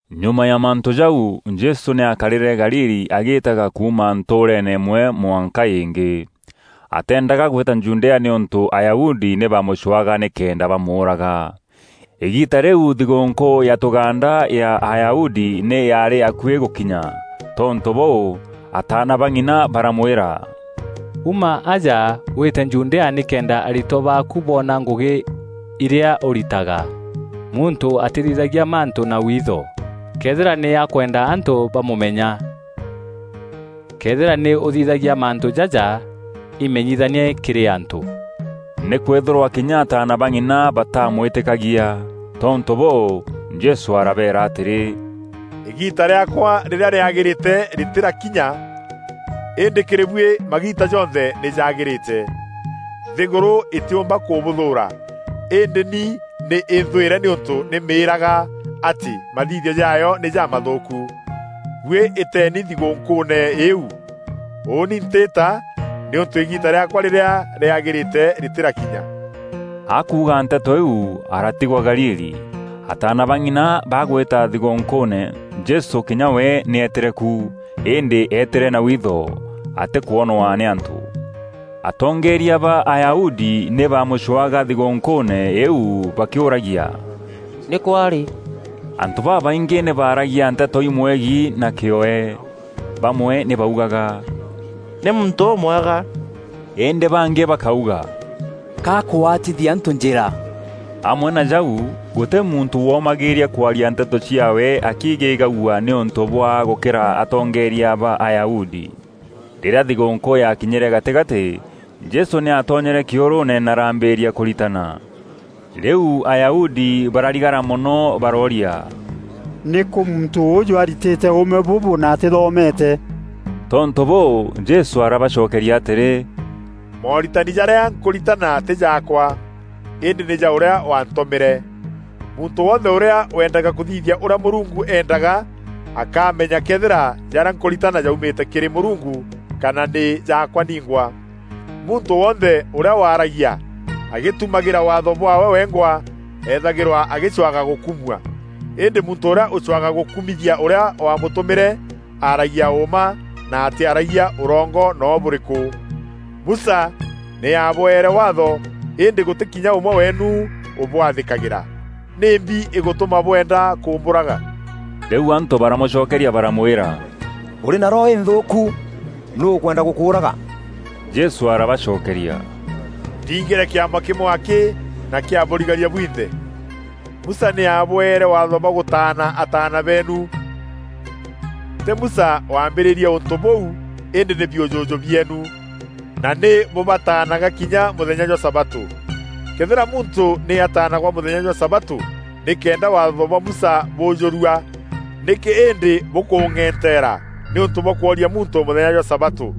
Nyuma ya mantû jau, Jesû nî aakarîre Galili agîtaga kuuma ntûûreene îmwe mwanka îngî. Ateendaga gwîta Judea nîûntû Ayahudi nî baamûcwaga nîkenda bamûûraga. Îgiita rîu thigûûnkû ya tûgaanda ya Ayahudi nî yaarî akuî gûkinya. Tontû bûû, ataana ba ng'ina baramwîra, “Uma aja wîte Judea nîkenda aritwa baaku boona ngûgî irîa ûritaga. Muntû atîthithagia mantû na witho, këethîra nî akwenda antû bamûmenya. Këethîra nî ûthithagia mantû jaja, imenyithanie kîrî antû.” Nîkwîthîrwa kinya ataana ba ng'ina bataamwîtîkagia! Tontû bûû, Jesû arabeera atîrî, “Îgiita rîaakwa rîrîa rîagîrîte rîtîrakinya, îndî kîrî buî magiita jonthe nî jagîrîte. Nthîgûrû îtîûmba kûbûthûûra, îndî ni nî înthwîre nîûntû nî mîîraga atî mathithio jaayo nî jamathûûku. Buî îteeni thigûûnkûûne îîu. Ûûni ntîîta, nîûntû îgiita rîaakwa rîrîa rîagîrîte rîtîrakinya.” Akuuga nteto iu, aratigwa Galili. Ataana ba ng'ina bagwîta thigûûnkûûne, Jesû kinya we nî eetîre ku. Îndî eetîre na witho, atîkwonwa nî antû. Atongeeria ba Ayahudi nî baamûcwaga thigûûnkûûne îîu bakîûragia, “Nîkû arî?” Antû babaîngî nî baaragia nteto imwegiî na kîoe. Bamwe nî baugaga, “Nî muntû ûmwega.” Îndî bangî bakauga, “Ka akwatithia antû njîra.” Amwe na jau, gûtî muntû womagîîria kwaria nteto ciaawe akiigîgagua nîûntû bwa gûkîra atongeeria ba Ayahudi. Rîrîa thigûûnkû yakinyîre gatîgatî, Jesû nî aatonyere kîûrûûne na araambîrîria kûritana. Rîu Ayahudi bararigara mono barooria, “Nîkû muntû ûûjû aritîte ûûme bûbû na atîthomeete?” Tontû bûû, Jesû arabacokeria atîrî, “Mooritani jarîa nkûritana tî jaakwa, îndî nî ja ûrîa waantûmîre. Muntû wonthe ûrîa wendaga kûthithia ûrîa Mûrungu eendaga, akaamenya këethîra jarîa nkûritana jaumîte kîrî Mûrungu, kana nî jaakwa ningwa. Muntû wonthe ûrîa waaragia agîtumagîra Waatho bwaawe wengwa eethagîrwa agîcwaga gûkumua. Îndî muntû ûrîa ûcwaga gûkûmithia ûrîa waamûtûmîre, aaragia ûûma na atîaragia ûrongo noo bûrîkû. Musa nî aabwere Waatho îndî gûtî kinya ûmwe weenu ûbwathîkagîra. Nîmbi îgûtûma bwenda kûmbûraga?” Rîu antû baramûcokeria baramwîra, “Ûrî na roho înthûûku! Nûû ûkwenda gûkûûraga?” Jesû arabacokeria, “Ndingîre kîama kîmwe akî na kîabûrigaria bwinthe! Musa nî aabwere waatho bwa gûtaana ataana beenu (tî Musa waambîrîrie ûntû bûu îndî nî biûjûjû bieenu) na nî bûbataanaga kinya mûthenya jwa sabatû. Këethîra muntû nî ataanagwa mûthenya jwa sabatû nîkenda Waatho bwa Musa bûûjûrua, nîkî îndî bûkûng'eenteera nîûntû bwa kwooria muntû mûthenya jwa sabatû?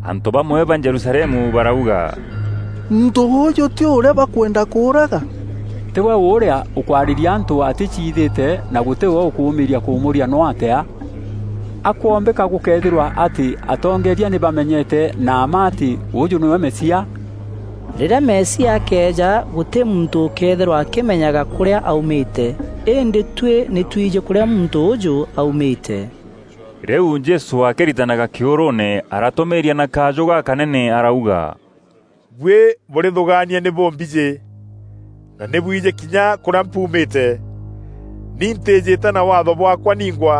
Antû bamwe ba Jerusalemu barauga, “Muntû ûûjû tî we ûrîa bakwenda kûûraga? Tî we ûrîa ûkwarîria antû atîciithîte na gûtî we ûkûûmîîria kûmûûria noo atîa? A kwoombîka gûkeethîrwa atî atongeeria nî bamenyete na mma atî ûûjû nîwe Mesia? Rîrîa Mesia akeeja gûtî muntû ûkeethîrwa akîmeenyaga kûrîa aumîte, îndî tuî nî twijî kûrîa muntû ûûjû aumîte.” Rîu Jesû akîritanaga kîûrûûne, aratûmîîria na kajû gakanene arauga, “Buî bûrîthûgaania nî bûmbijî, na nî bwijî kinya kûrîa mpuumîte. Ni ntîîjîte na Waatho bwaakwa ningwa,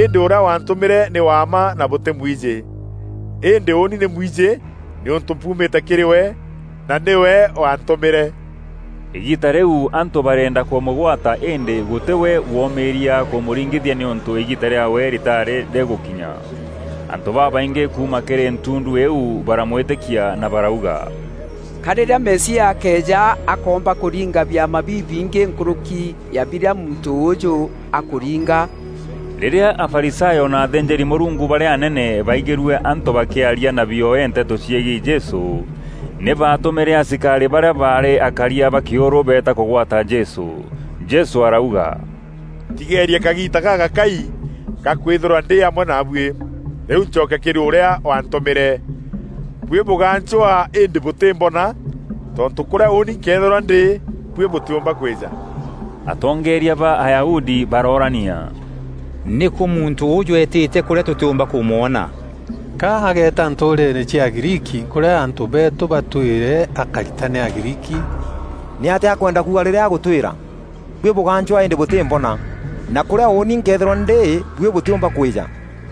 îndî ûrîa waantûmîre nî wa mma na bûtîmwijî. Îndî ûûni nî mwijî nîûntû mpuumîte kîrî we, na nîwe waantûmîre.” Îgiita rîu antû bareenda kûmûgwata îndî gûtî we womîîria kûmûringithia nîûntû îgiita rîaawe rîtaarî rîgûkinya. Antû babaingî kuuma kîrî ntundu iu baramwîtîkia na barauga, “Ka rîrîa Mesia akeeja akoomba kûringa biama bibingî nkûrûki ya birîa muntû ûûjû akûringa?” Rîrîa Afarisayo na athînjîri-Mûrungu barîa anene baigîrue antû bakîaria na bioe nteto ciegiî Jesû, nî baatûmîre asikarî barîa baarî akaria ba kîûrû beeta kûgwata Jesû. Jesû arauga, “Ntigeerie kagiita gagakai ga kwîthîrwa ndî amwe naabuî, rîu ncoke kîrî ûrîa waantûmîre. Buî bûgancwa îndî bûtîmbona, tontû kurîa ûûni nkeethîrwa ndî, buî bûtîumba kwîja.” Atongeeria ba Ayahudi baroorania, “Nîkû muntû ûûjû eetîte kûrîa tûtîûmba kûmwona? Ka ageeta ntûûreene cia Agriiki kûrîa antû beetû batwîre akaritane Agriiki? Nîatîa akwenda kuuga rîrîa agûtwîra, ‘Buî bûgancwaa îndî bûtîmbona, na kûûrîa ûûni nkeethîrwa ndî buî bûtîûmba kwîja?’”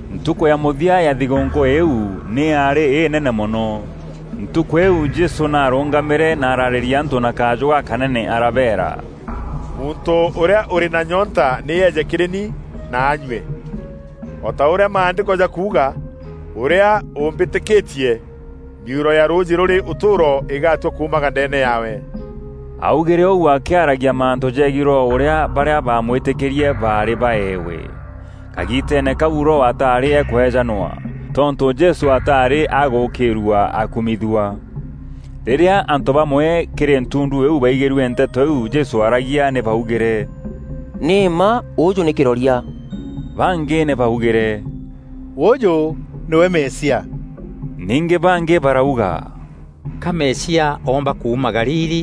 Ntukû ya mûthia ya thigûûnkû îîu, nî yaarî înene mono. Ntukû îîu Jesû nî aarûngamîre na ararîria antû na kajû gakanene arabeera, “Muntû ûrîa ûrî na nyoonta nî eeje kîrî ni na anyue. O ta ûrîa Maandîko jakuuga: ‘Ûrîa ûûmbîtîkîtie, mîuro ya rûûjî rûrî ûtûûro îgatua kuumaga ndeene yaawe.’” Augîre ûu akîaragia mantû jegiî Roho ûrîa barîa baamwîtîkîtie baarî baeewe. Kagiiteene kau Roho ataarî akweejanwa, tontû Jesû ataarî agûûkîîrua akumithua. Rîrîa antû bamwe kîrî ntundu îîu baigîrue nteto iu Jesû aaragia nî baugîre, “Nî mma ûûjû nî kîroria.” Bangî nî baugîre, “Ûûjû nîwe Mesia!” Ningî bangî barauga, “Ka Mesia oomba kuuma Galili?”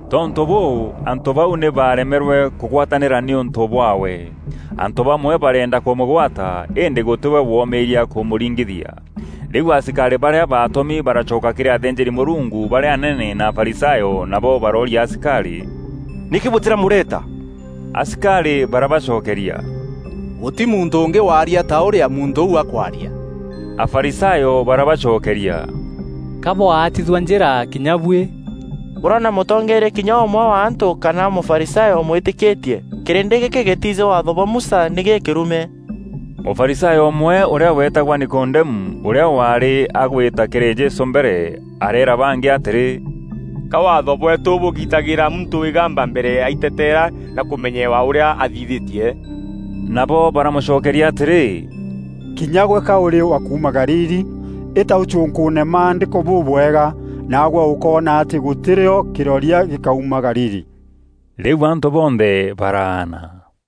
Tontû bûû, antû bau nî baremerwe kûgwatanîra nîûntû bwaawe. Antû bamwe bareenda kûmûgwata, îndî gûtî we womîîria kûmûringithia. Rîu asikarî barîa baatûmi baracoka kîrî athînjîri-Mûrungu barîa anene na Afarisayo, nabo barooria asikarî, “Nîkî bûtîramûreta?” Asikarî barabacokeria, “Gûtî muntû ûngî waaria ta ûrîa muntû ûu akwaria!” Afarisayo barabacokeria, “Ka bwaatithua njîra kinya buî? Bûrona mûtongeeria kinya ûmwe wa antû kana Mûfarisayo ûmwîtîkîtie? Kîrîndî gîkî gîtijî Waatho bwa Musa, nî gîkîrume!” Mûfarisayo ûmwe ûrîa weetagwa Nikodemu, ûrîa waarî agwîta kîrî Jesû mbere, areera bangî atîrî, “Ka Waatho bweetû bûgitagîra muntû îgamba mbere ya aiteetera na kûmenyewa ûrîa athithîtie?” Nabo baramûcokeria atîrî, “Kinya gwe ka ûrî wa kuuma Galili? Îta ûcûnkûûne Maandîko bûbwega, naagwe ûkoona atî gûtî rîo kîroria gîkauma Galili!” [ Rîu antû bonthe baraana.